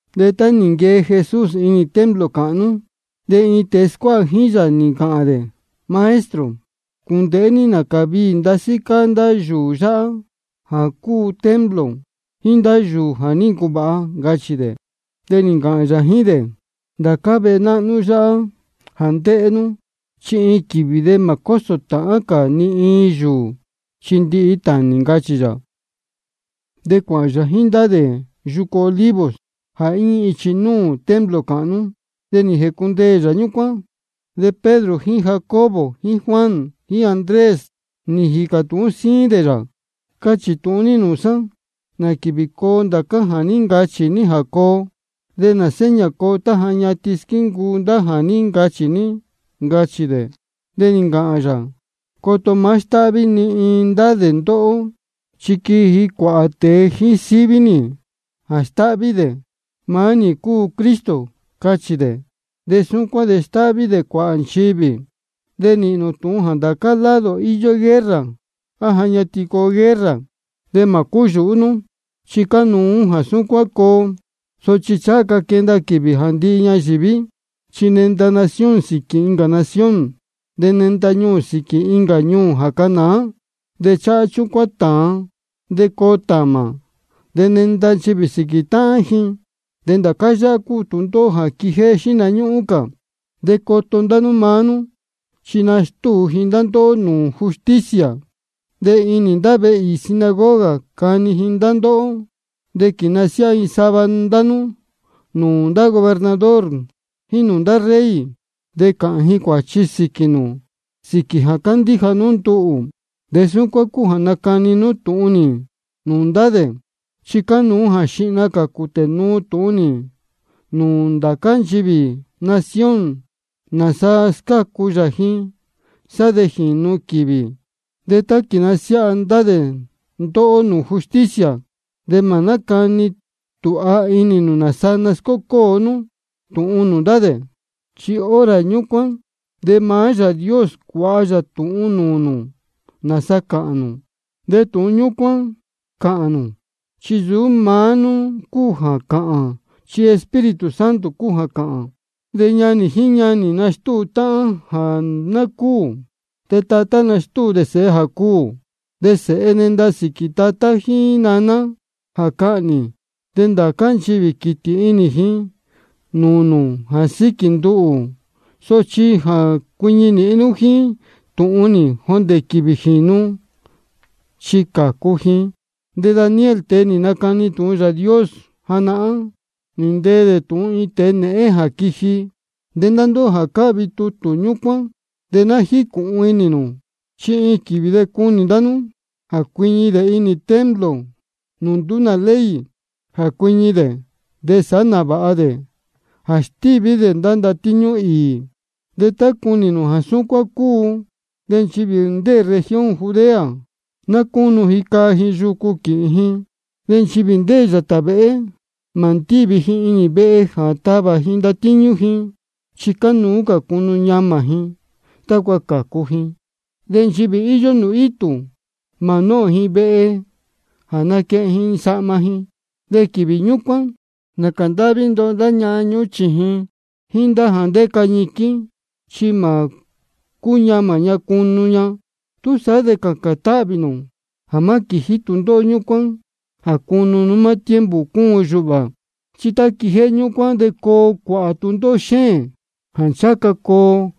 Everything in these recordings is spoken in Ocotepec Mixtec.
De tá nī nquee Jesús inī templo cāhnú, de iin tēe scuáha jíín yā nī ncāhān dē: Maestro, cūndēhé ní nācā viī ndasí cáá ndá vehe yáhá jā cúu templo, jíín ndá yūū jā ní ncuvāha, ncachī dē. De nī ncāhān yā jíín dē: Ndācá vehe náhnú yáhá jā ndéhé nú, chi iin quīvī mā cósō tāhán cā ni iin yūū, chi ndihi tānī, ncachī yā. De cuāhān yā jíín ndá dē yucu Olivos, jā íñí ichi núū templo cāhnú. De nī jēcundeē yā ñúcuán. De Pedro jíín Jacobo jíín Juan jíín Andrés, nī jīcā tūhún síín dē yā: Cachī tūhun ní nūū sá, ¿nā quīvī coo ndācá jā ní ncachī ní jā coo? ¿De nā seña coo tá ja ñatin squíncuu ndá jā ní ncachī ní? ncachī dē. De nī ncāhān yā: Coto má stáhví ni iin dē ndá ndóhó. Chi quiji cuāhā tēe jíín síví nī jā stáhví: Maá nī cúu Cristo, cachī dē. De súcuán de stáhví dē cuāhā nchivī. De nīhīn nū tūhun jā ndācá lado íyó guerra, á ja ñatin coo guerra. De mā cúyūhú nú, chi cánuú jā súcuán coo, sochi ncháha ca quenda quīvī jā ndihi ñayīví. Chi nenda nación sīquī incā nación, de nenda ñuū sīquī incā ñuū jā canāá. De cháhá chúcuán tāan, de coo tāmā, de nenda nchivī sīquī táhán ji. De ndācá yáhá cúu tūndóhó jā quijéhé xihna ñúhún cā. De coto ndá nú maá nú, chi nastúu ndá ji ndóhó nūū justicia, de inī ndá vehe īī sinagoga cani ndá ji ndóhó. De quīnasiáha ji sava ndá nú nūū ndá gobernador jíín nūū ndá rey, de cāhān ji cuāchi sīquī nū sīquī jā cándíja nú nduhū. De súcuán de cuu nacani nú tūhun nī nūū ndá dē. Chi cánuú jā xihna cā cūtē nuu tūhun nūū nchivī ndācá nación nāsa scácu nī ji, sá de jīnu quīvī. De tá quīnasiáha ndá dē ndóhó nūū justicia, de mā nácani tūha inī nū nāsa nascócóo nú tūhun nūū ndá dē. Chi hora ñúcuán de maá Yāā Dios cuāha yā tūhun nūū nū nāsa cāhān nū, de tūhun ñúcuán cāhān nū. Chi nsūú maá nú cúu jā cāhān, chi Espíritu Santo cúu jā cāhān. De ñanī jíín ñanī nastúu táhán jā ná cúū. De tatá nastúu sēhe jā cuū. De sēhe nenda sīquī tatá jíín naná jā cahnī. De ndācá nchivī quītī inī ji nūū nū jā síquī nduhū. Sochi nchivī jā cuiñi nīhin jíín tūhun nī jondē quīvī jīnu, chi cācu ji. De Daniel, tēe nī nacani tūhun Yāā Dios, nī ntee dē tūhun iin tēe nēhén jā quiji. De ndá ndóhó jā cáhvi tutū ñúcuán, de ná jícūhun inī nū. Chi iin quīvī de cunī ndá nú jā cuiñi dē inī maá templo nūū nduú nā ley jā cuiñi dē, de sāhá nāvāha dē jā stíví dē ndá ndatíñú īī. De tá cunī nū jā súcuán cúu, de nchivī ndéē región Judea, ná cúnu ji caa ji yucu quīhīn ji. De nchivī ndéē yātā vēhé, mā ndívi ji inī vehe jā tavā ji ndatíñú ji, chi cánuú jā cunu ñamā ji tácua cācu ji. De nchivī íyó nūū itū, mā nóhōn ji vehe jā naquehen ji sahma ji. De quīvī ñúcuán, nācā ndáhví ndoho ndá ñahan ñúhún sēhe jíín jā ndéca ñiquín, chi mā cúñamā ña cunu ña. Túsaá de cācān táhvī nū jā má quījí tūndóhó ñúcuán jā cunu nú maá tiempo cúun yūhā. Chi tá quijéhé ñúcuán de coo cuāhā tūndóhó xéēn, jāá ncháha ca coo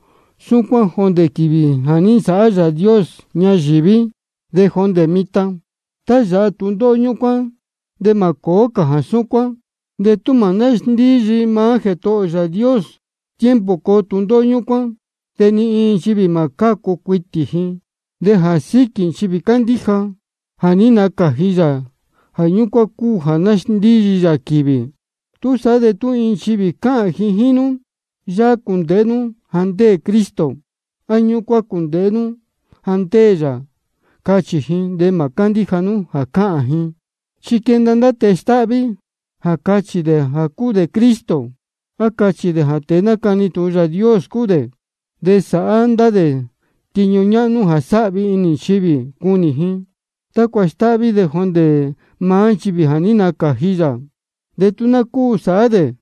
súcuán jondē quīvī jā ní nsāhá Yāā Dios ñayīví de jondē mitan. De tá yāha tūndóhó ñúcuán de ni mā cōó cā jā súcuán. De tú mā násndíyi maá Jētohō ō Yāā Dios tiempo coo tūndóhó ñúcuán, de ni iin nchivī mā cácu cuitī ji. De jā síquī nchivī cándíja jā ní nacāji yā, jā ñúcuán cúu jā nasndíyi yā quīvī. Túsaá de tú iin nchivī cāhān jíín nú: Yáhá cūndēhé nú jā ndéē Cristo, á: Ñúcuán cūndēhé nú jā ndéē yā, cachī ji, de mā cándíja nú jā cáhān ji. Chi quenda ndá tēe stáhví jā cachī dē jā cúu dē Cristo, á cachī dē jā tēe nácani tūhun Yāā Dios cúu dē. De sāhá ndá dē tiñu ñáhnú jā sāhvi inī nchivī cunī ji, tácua stáhví dē jondē maá nchivī jā ní nacāji yā, de tú ná cúu sāhá dē.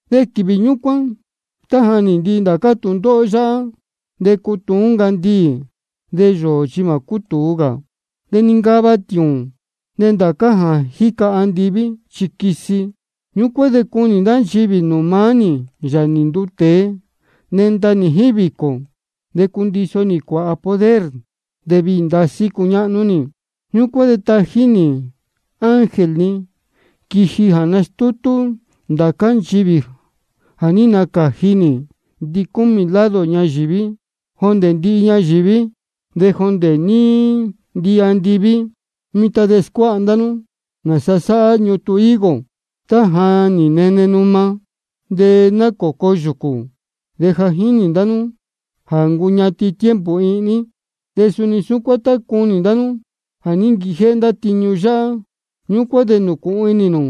De quīvī ñúcuán, tá ja nī ndihi ndācá tūndóhó yáhá, de cutuún ncandiī, de yōō chi mā cútūu cā. De nincava tiūūn, de ndācá jā jíca andiví chi quisi. Ñúcuán de cunī ndá nchivī nūū maá nī, Yāā nī nduu tēe, nenda nī jíín vīcō, de cundiso nī cuāhā poder, de viī ndasí cuñáhnú nī. Ñúcuán de tají nī ndá ángel ni quiji jā nastútú ndācá nchivī jā ní nacāji nī ndicúmī lado ñayīví, jondē nūū ndíhi ñayīví de jondē nūū ndíhi andiví. Mitan de scuáha ndá nú nāsa sáhá ñutun higo: Tá ja nī nene numa, de nī nacōco yūcū, de ja jínī ndá nú ja nī ncuñatin tiempo ihní. De suni súcuán tá cunī ndá nú jā ní nquijéhé ndá tiñu yáhá, ñúcuán de jīcūhun inī nū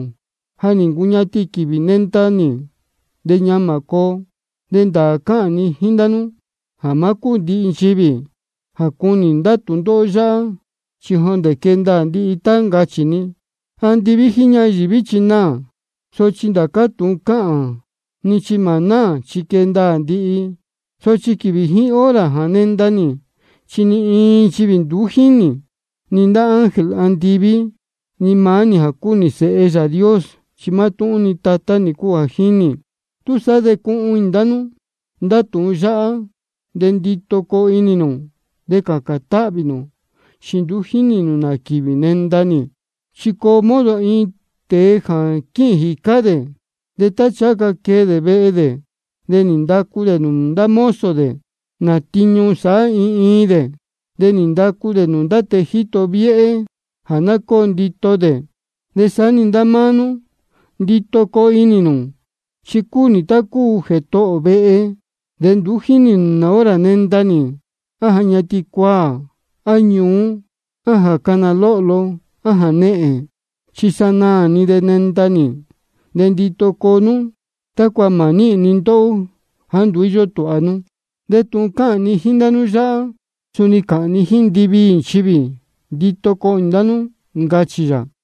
ja nī ncuñatin quīvī nenda nī, de ñamā coo. De ndāā cáhān ni jíín ndá nú jā má cúū ndihi nchivī jā cunī ndá tūndóhó yáhá, chi jondē quee ndaā ndihi tá ncachī ni. Andiví jíín ñayīví chi naā, sochi ndācá tūhun cáhān ni chi mā náā, chi quee ndaā ndihi. Sochi quīvī jíín hora jā nenda nī, chi ni iin nchivī nduú jínī, ni ndá ángel andiví, ni maá nī jā cúu Sēhe Yāā Dios. Chi mátúhún-ni Tatá nī cúu jā jínī. Túsaá de cuhun inī ndá nú ndá tūhun yáhá, de ndito coo inī nū, de cācān táhvī nū, chi nduú jínī nū nā quīvī nenda nī. Chi coo modo iin tēe jā quíhīn jīcá dē, de tá ncháha ca quee dē vehe dē, de nī ndacu dē nūū ndá mozo dē nā tiñu sāhá iin iin dē. De nī ndacu dē nūū tēe jíto viéhé jā ná cóo ndito dē. De saá-ni ndá máá nú, ndito coo inī nū. Chi cúu nī tá cúu jētohō vehe, de nduú jínī nū nā hora nenda nī, á ja ñatin cuaā, á ñuú, á jā cána lohló, á jānehēn. Chi iin sanaā-ni de nenda nī, de ndito coo nú tácua mā níhīn ni ndóhó jāá nduú íyó tūha nú. De tūhun cáhān ni jíín ndá nú yáhá, suni cáhān ni jíín ndiviī nchivī: Ndito coo inī ndá nú, ncachī yā.